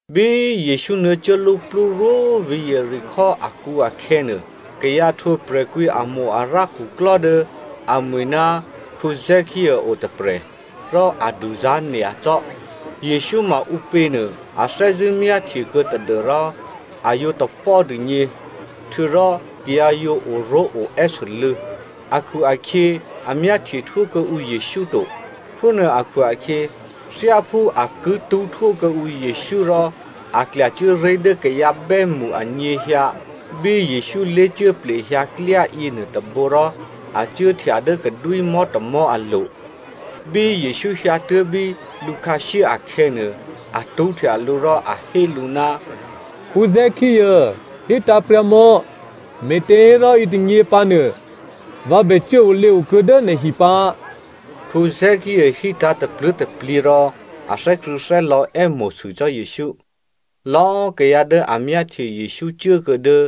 Bí Jesǔ nuô̌cuốluplú rwó vǐ̤ Jeriko akǔ akhè̌nuô, kayǎ htwǒ prè̤kwǐamo-arǎ khuklò́ dố amwi̤ ná Zakeǔ o tôprè̤, rò a duzá̤ nyacò́. Jesǔ ma ǔpě nuô a thè́zṳ̂́ myáhtye kuô̌ tadû́rò a yǒ tapò́ dûgně, htuô̌rò kayǎ yǒ oró̤oè́sû́lû̌ akhu-akhyě a myáhtyehtwó kuô̌ǔ Jesǔ to. Phúnuô akhu-akhyě, thyáphú a ki tṳ́htwó kuô̌ǔ Jesǔ rò, a klyacuố ré̤ dố kayǎ bè́mṳ anyěhyǎ bí Jesǔ lé̤cuố plehyǎ klyá yěnuô tôbǒ rò a cuốhtya dố kadwímò̤́ tômò̤́ alo̤. Bí Jesǔ hyǎtuố̤ bí lǔkhǎshyé akhè̌nuô, a tṳ́htya lǔ rò a hé lǔ, “Zakeǔ, hítǎ̤pryǎ mò̌, me̤těhérò yětônyě pǎnuô, vǎ bè cuốolěo kuô̌ dố nè̤hi pǎ.” Zakeǔ hítǎ̤ tapluố̤taplyě rò a thè́krṳ̂̌thè́lò̌ è́mo̤sû cò́ Jesǔ. Lò̌꤮ kayǎ dố a myáhtye Jesǔ cuố kuô̌ dố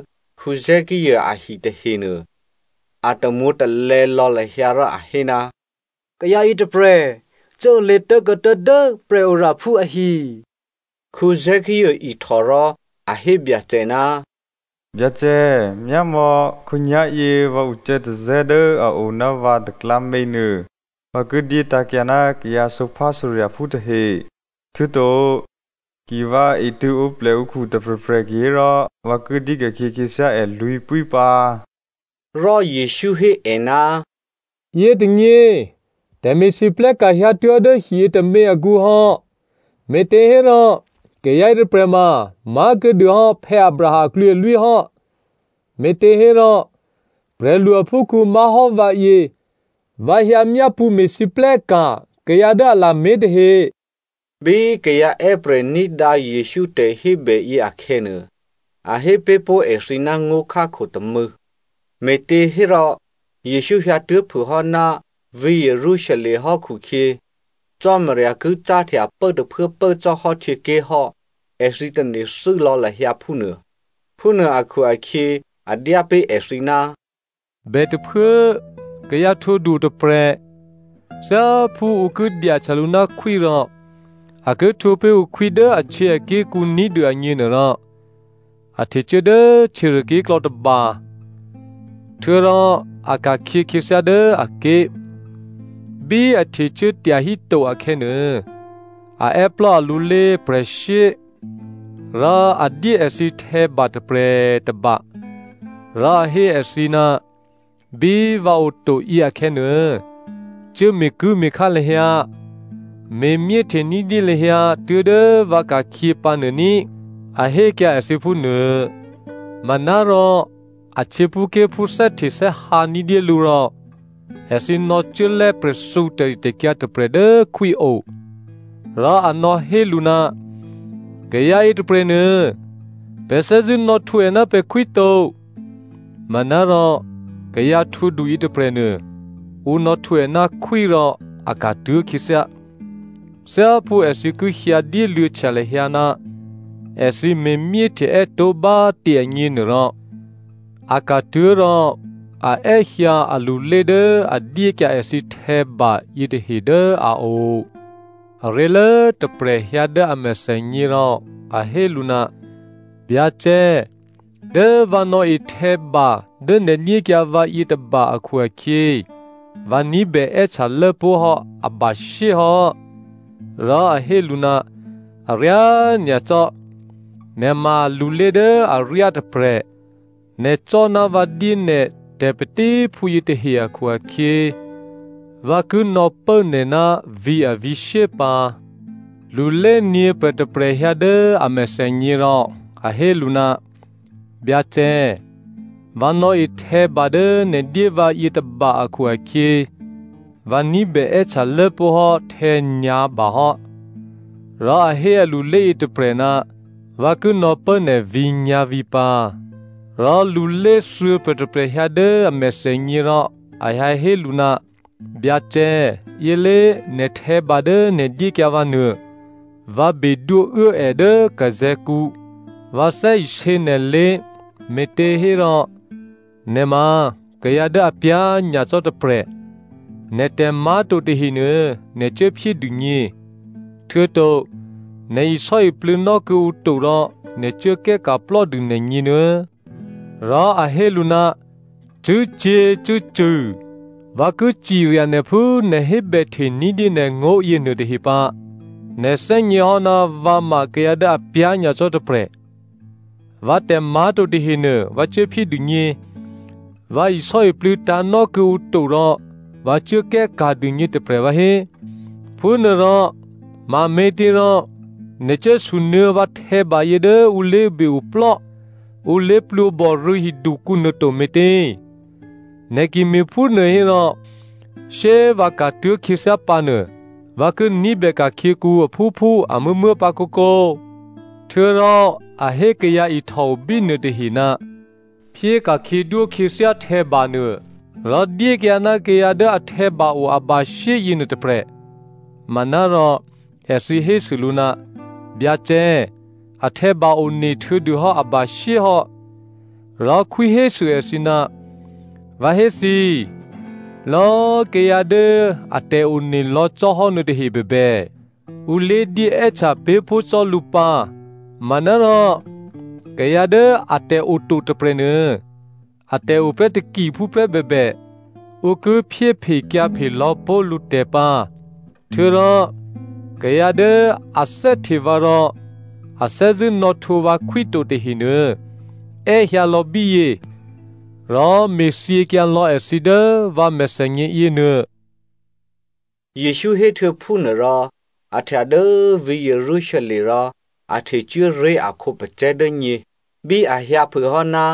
Zakeǔ ahi tahenuô, a tamwǒ̤talè̌ lò̌ lahyǎ rò a hé, “Kayǎ yětôprè̤ cuốolě tố̤kuô̌ tuố̤dố prè̤oraphú ahi.” Zakeǔ ihtò rò a hé Byacè, “Byacè, myámò̌, khǒnyá̤yě vǎ ucè̌tazè̌ dố a o ná vǎ taklǎměnuô, vǎ ki dyétǎ̤kyǎ ná kayǎ sǒphásǒrya̤phú tahe. Htuô̌to ki vǎ etṳ̂̌ǒplè ǔkhu tôprè̤prè̤ kihérò, vǎ ki dyéka̤khyě khyěthyá è lwǐ̤pwí pǎ.” Rò Jesǔ hé è, “Yětônyě, tè̤me̤lwóhteka̤ hyǎtuố̤ dố hiyě tômě akǔhò́ me̤těhérò kayǎ yětôprè̤ ma má̤kuô̌dû hò́ Abraham aklwǐalwí hò́! Me̤těhérò prè̤lu aphúkhǔ má̤hò́ vǎyě, vǎ hyǎ myápṳ̌ me̤lwóhteka̤ kayǎ dố a lamé̤ tahe.” Bí kayǎ è́prè̤ ní̤dǎ Jesǔ tè̤hébè yě akhè̌nuô, a hé pé̤ pó̤ èthǐ ná ngó̤khákho tômû̌, me̤těhérò Jesǔ hyǎtuố̤ phû hò́ ná vǐ̤ Jerusalem hò́ khukhyě, Cò́marya ki cáhtya pố tôphuố pố cò́hò́ htyěké̤ hò́, èthǐ tane̤thû́ lò̌ lahyǎ phúnuô. Phúnuô akhu-akhyě a dyá pé̤ èthǐ, “Bètôphuố kayǎ htwǒdu otôprè̤. Thyáphú ǔ ki dyahtya lǔ ná khwí rò a ki htwǒ pé̤ ǔ khwí dố ahtyěaké̤kǔ ní̤dû agněnuôrò, a htecuố dố htyěruôké̤klò̌ tôba, htuô̌rò a ka̤khyě khyěthyá dố aké̤. Bí a htecuố tyahíto akhè̌nuô, a è́plò́ alulé prè̤shyé, rò a dyé èthǐ htè̌ba tôprè̤ tôba, rò a hé èthǐ, ‘Bí vǎ oto yěakhè̌nuô, cuố me̤kuố̤me̤khá lahyǎ, me̤myéhte ní̤dyé lahyǎ tuố̤dố vǎ ka̤khyě pǎ nuô ní,’ a hékyǎ èthǐ phúnuô. “Manárò, a htyěphúké̤phú thè́htethè́hǎ ní̤dyé lǔ rò èthǐ nò̌cuố lè̤́ prè̤thǔ tè̤ritè̤kyǎ tôprè̤ dố khwí o, rò a nò̌hé lǔ, ‘Kayǎ yětôprè̤nuô, pè̤ thè́zṳ̂́ nò̌htwǒ è ná pè̤khwí to.’ “Manárò kayǎ htwǒdu yětôprè̤nuô, ǔ nò̌htwǒ è ná khwí rò a ka̤tuố̤ khyěthyá. Thyáphú èthǐ ki hyǎ dyéluô̌htya lahyǎ ná èthǐ me̤phúhteè́ tó̤ bá꤮ tě agněnuôrò, a ka̤tuố̤ rò a è́hyǎ alulé dố a dyékyǎ èthǐ htè̌ba yětahe dố a o. “Aré̤lố tôprè̤ hyǎ dố a mèthènyě rò a hé lǔ, ‘Byacè, dố vǎ nò̌e htè̌ba dố nè̤ dyékyǎ vǎ yětôba akhu-akhyě vǎ ní̤bè è́htyalốpó̤ hò́ abashyé hò́.’ “Rò a hé lǔ, ‘Aryá nyacò́! Nè̤ ma lulé dố aryá tôprè̤! Nè̤ cò́ ná vǎ dyé nè̤ tè̤patíphú yětahe akhu-akhyě, vǎ ki nò̌pố nè̤ ná vǐ̤ avǐ̤shyé pǎ.’ “Lulé nyě̤prè̤ tôprè̤ hyǎ dố a mèthènyě rò a hé lǔ, ‘Byacè, vǎ nò̌e htè̌ba dố nè̤ dyé vǎ yětôba akhu-akhyě, vǎ ní̤bè è́htyalốpó̤ hò́ htè̌nyǎ̤ba hò́.’ “Rò a hé alulé yětôprè̤, ‘Vǎ ki nò̌pố nè̤ vǐ̤ nyǎ̤vǐ̤ pǎ.’ “Rò lulé thuô̌prè̤ tôprè̤ hyǎ dố a mèthènyě rò a hyǎhé lǔ, ‘Byacè, yě lé꤮ nè̤ htè̌ba dố nè̤ dyékyǎ vǎnuô. Vǎ bedwóuố è dố zè̤̌krikǔ. Vǎ thè́isě nè̤lé̤, me̤těhérò nè̤ ma kayǎ dố apyá̤ nyacò́ tôprè̤. Nè̤tè̤ má̤to tahenuô, nè̤ cuố phyé dûgně. Htuô̌to nè̤ isò́iplû̌nò́ kuô̌ǔ to rò nè̤ cuố kè́ka̤plò́ dû nè̤gněnuô̌.’ “Rò a hé lǔ, ‘Cṳ̂́cyě̤cṳ̂́cṳ̂, vǎ ki cirya nè̤ phú nè̤ hébèhte ní̤dyé nè̤ngó̤ yěnuôtahe pǎ. Nè̤ thè́gněhò́ ná vǎ ma kayǎ dố apyá̤ nyacò́ tôprè̤. Vǎtè̤ má̤to tahenuô vǎ cuốphyé dûgně. Vǎ isò́iplû̌tǎ̤nò́ kuô̌ǔ to rò vǎ cuốkè́ ka̤ dûgně tôprè̤ vǎhé! Phúnuôrò mame̤těrò nè̤ cuốsunuô̌ vǎ htè̌bayě dố ǔ lé̤be-oplò́ ǔ lé̤plwǒbò rû̌ hidukǔ nuô to me̤tě? Nè̤ ki me̤phúnuô hérò, shyé꤮ vǎ ka̤tuố̤ khyěthyá pǎ nuô, vǎ ki ní̤bè ka̤khyěkǔ aphúphú amuố̤muố̤ pǎ kǒkǒ.’ “Htuô̌rò a hé kayǎ ihtòo bínuô tahe, ‘Phyé ka̤khyědwó khyěthyá htè̌banuô rò dyékyǎ ná kayǎ dố ahtè̌ba o abashyé yěnuô tôprè̤.’ “Manárò èthǐ hésû lǔ, ‘Byacè, ahtè̌ba onehtuô̌ dû hò́ abashyé hò́!’ “Rò khwí hésû èthǐ, ‘Vǎ hé thǐ, lò̌꤮ kayǎ dố atè̤one lò̌ cò́hò́ nuôtahe bèbè, ǔ lédyé è́htya pé̤pó̤ cò́ lǔ pǎ, manárò kayǎ dố atè̤ o to tôprè̤nuô, atè̤ oprè́ takiphúprè́ bèbè, ǔ ki phyéphekyǎphe lò̌ pó̤ lǔtè̤ pǎ. Htuô̌rò, kayǎ dố a thè́hte vǎ rò a thè́zṳ̂́ nò̌htwǒ vǎ khwí to tahenuô, è́hyǎ lò̌ bíyě rò me̤thyěkyǎ lò̌ èthǐ dố vǎ mèthènyě yěnuô!’” Jesǔ héhtuô̌ phúnuôrò, a htya dố vǐ̤ Jerusalem rò a htecuố ré̤ a khǒpacè̤̌ dố nyě. Bí a hyǎphûhò́ ná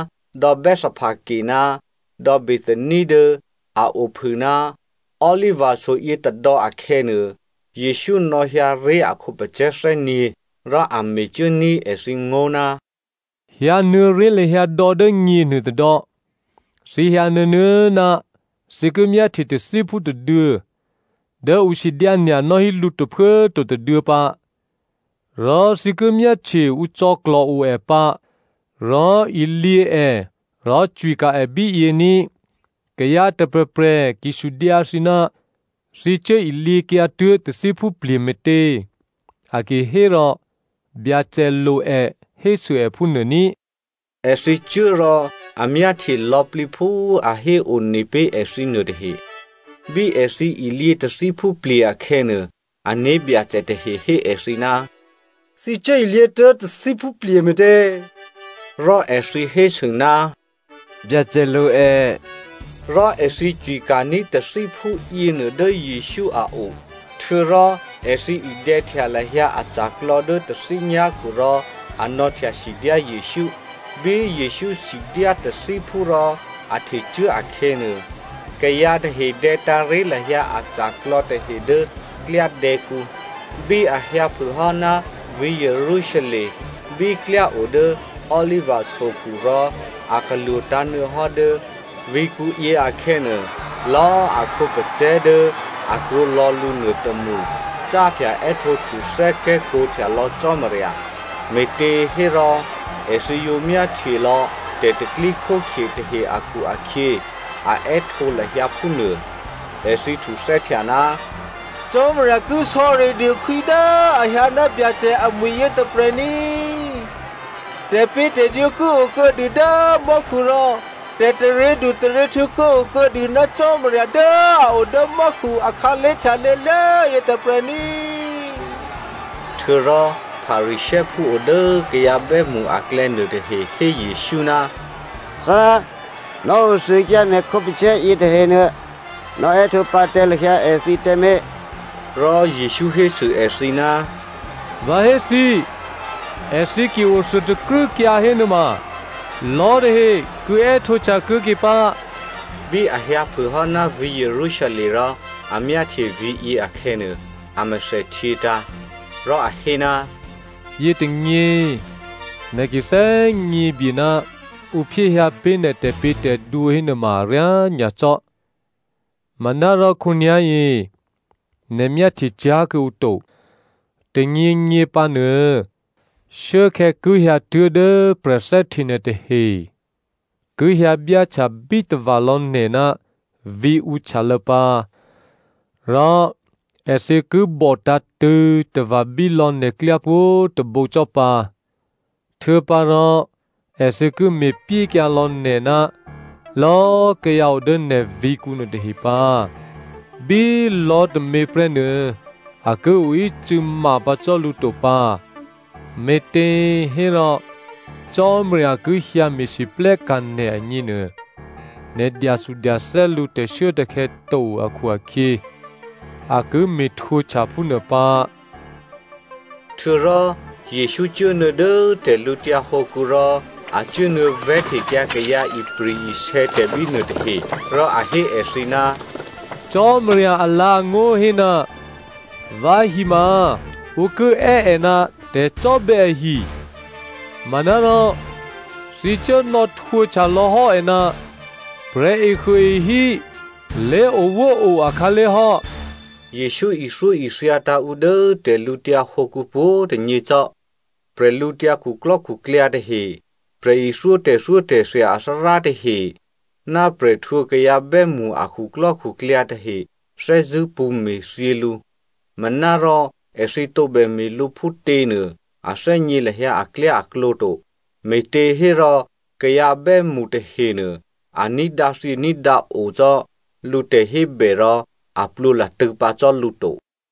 dò̌ Bethphage ná dò̌ Bethania dố a ophû ná Oliva so yětôdò̌ akhè̌nuô, Jesǔ nò̌hyǎ ré̤ a khǒpacè̤̌ thè́nyě̤. Rò a mecuốní̤ èthǐ ngó̤, “Hyǎnuô̌ré̤ lahyǎ dò̌ dố nyěnuô tôdò̌, thǐ hyǎ nuô̌nuô̌ ná thǐ ki myáhtye tathíphú tôduô̌ dố ǔ sidyánya̤ nò́hí lǔ tôphuố꤮ to tôduô̌ pǎ. Rò thǐ ki myáhtye ǔ cò̌klò̤ o è pǎ, rò ilyě è rò cwika̤ è bíyě ní꤮. Kayǎ tôprè̤prè̤ ki sudyǎ thǐ, ‘Thǐ cuố ilyěkyǎtuố̤ tathíphú plye̤ me̤tě?’ A ki hérò, ‘Byacè lo è,’ hésû è phúnuô ní꤮.” Èthǐ cuố rò a myáhtye lò̌plǐ phú a héone pé̤ èthǐnuô tahe. Bí èthǐ ilyě tathíphú plye̤ akhè̌nuô, ané̤byacè tahe hé èthǐ, “Thǐ cuốilyě tuố̤ tathíphúplye̤ me̤tě?” Rò èthǐ hésû, “Byacè lo è.” Rò èthǐ cwika̤ní̤ tathíphú yěnuô dố Jesǔ a o. Htuô̌rò èthǐ idè̌htya lahyǎ aca̤klò̌ dố tathí nyá̤khu rò a nò̌htyasidyá Jesǔ. Bí Jesǔ sidyá tathíphú rò a htecuố akhè̌nuô, kayǎ tahe dè̌tǎ̤ ré̤ lahyǎ aca̤klò̌ tahe dố klyádè̌kǔ. Bí a hyǎphûhò́ ná vǐ̤ Jerusalem, bí klyá o dố Oliva sokhu rò a talwǒ̤tǎ̤ nuô̌hò́ dố vǐ̤kǔ yě akhè̌nuô, lò̌꤮ a khǒpacè̤̌ dố a krwǒ lò̌ lǔ nuôtômṳ cáhtya è́htǒhtuthè́ kè́kǒhtya lò̌ Cò́marya, me̤těhérò èthǐ yǒ myáhtye lò̌ tè̤pro̤tè̤prya̤ tahe akhu-akhyě, a è́htǒ lahyǎ phúnuô. Èthǐ htuthè́htya, “Cò́marya ki sò̌ridû khwí dố a hyǎ ná Byacè amwi̤ yětôprè̤ ní! Tè̤pě̤tè̤dwǒ ki o kuô̌dû dố mò́khu rò tè̤taryědu taryěhtǔ ki o kuô̌dû ná Cò́marya dố a o dố mò́khu akhǎlé̤ htyalô̌lố yětôprè̤ ní!” Htuô̌rò Pharisěophú o dố kayǎ bè́mṳ aklè̌ nuôtahe hé Jesǔ, “Thárá, nò̌othuôkyǎ nè̤ khǒpacè̤̌ yětahenuô, nò̌èhtǒ pǎ tǎ lahyǎ èthǐ tǎmé̤.” Rò Jesǔ hésû èthǐ, “Vǎ hé thǐ, èthǐ ki othuôtakrû́kyǎ hénuôma, lò̤́ tahe ki è́htǒhtya kuô̌ke pǎ.” Bí a hyǎphûhò́ ná vǐ̤ Jerusalem rò a myáhtye vǐ̤yě akhè̌nuô, a mèthèhtyětǎ̤. Rò a hé, “Yětônyě, nè̤ ki thè́gně bye ná ǔ phyéhyǎ pé̤ nè̤ tè̤pě̤tè̤dwǒ hénuôma aryá nyacò́, manárò khǒnyá̤yě nè̤ myáhtye cyá̤ kuô̌ǔ to. Tônyěnyě pǎnuô, shuốkhè̌ ki hyǎtuố̤ dố prè̤thè́hte nè̤ tahe ki hyǎ byáhtya bítava̤ lò̌ nè̤ ná vǐ̤ǔ htyalô̌ pǎ, rò èthǐ ki bòtǎ̤tṳ̂̌ tava̤bí lò̌ nè̤klyá pwǒ̤꤮ tôbǒ cò́ pǎ. Htuô̌pǎrò èthǐ ki me̤pyékyǎ lò̌ nè̤ ná lò̌꤮ kayǎ o dố nè̤ vǐ̤kǔ nuôtahe pǎ. Bí lò̤́tômě prè́ nuô a ki oícû̌ ma pǎ cò́ lǔ to pǎ, me̤těhérò Cò́marya ki hyǎ me̤lwóhteka̤ nè̤ agněnuô, nè̤ dyathudyathè́ lǔ tè̤shuốtè̤khè̌ to akhu-akhyě, a ki me̤htwǒhtya phúnuô pǎ.” Htuô̌rò Jesǔ cuốnuô̌ dố tè̤lǔtyǎ hǒkǔ rò a cuốnuô̌ vè̤́htekyǎ kayǎ ipri̤-isè̌tè̤ bínuô tahe. Rò a hé èthǐ, “Cò́marya alǎ̤angó̤ hé, ‘Vǎhi ma ǔ ki è́ è ná tè̤cò́bè̌ ahi,’ manárò thǐ cuốnò̌ htwǒhtya lò̤́hò́ è ná ‘Prè̤ehuôehí lé̤owóo akhǎlé̤ hò́.’” Jesǔ ithyóithyatǎ̤ ǔ dố tè̤lǔtyǎ hǒkǔ pwǒ̤꤮ tônyě cò́. Bwídukhu tahe, prè̤ithyó tè̤thyótè̤thya athárá tahe, ná prè̤ htwǒ kayǎ bè́mṳ a khuklò́khuklyǎ tahe thè́zṳ̂́ pṳ̌me̤thyě lǔ. Manárò èthǐ tǒbè me̤ lǔ phútěnuô, a thè́gně lahyǎ aklyáaklǒ to, me̤těhérò kayǎ bè́mṳ tahenuô a ní̤dǎthyění̤dǎo cò́ lǔ tè̤hébè, rò a plwǒ latṳ̂̌ pǎ cò́ lǔ to.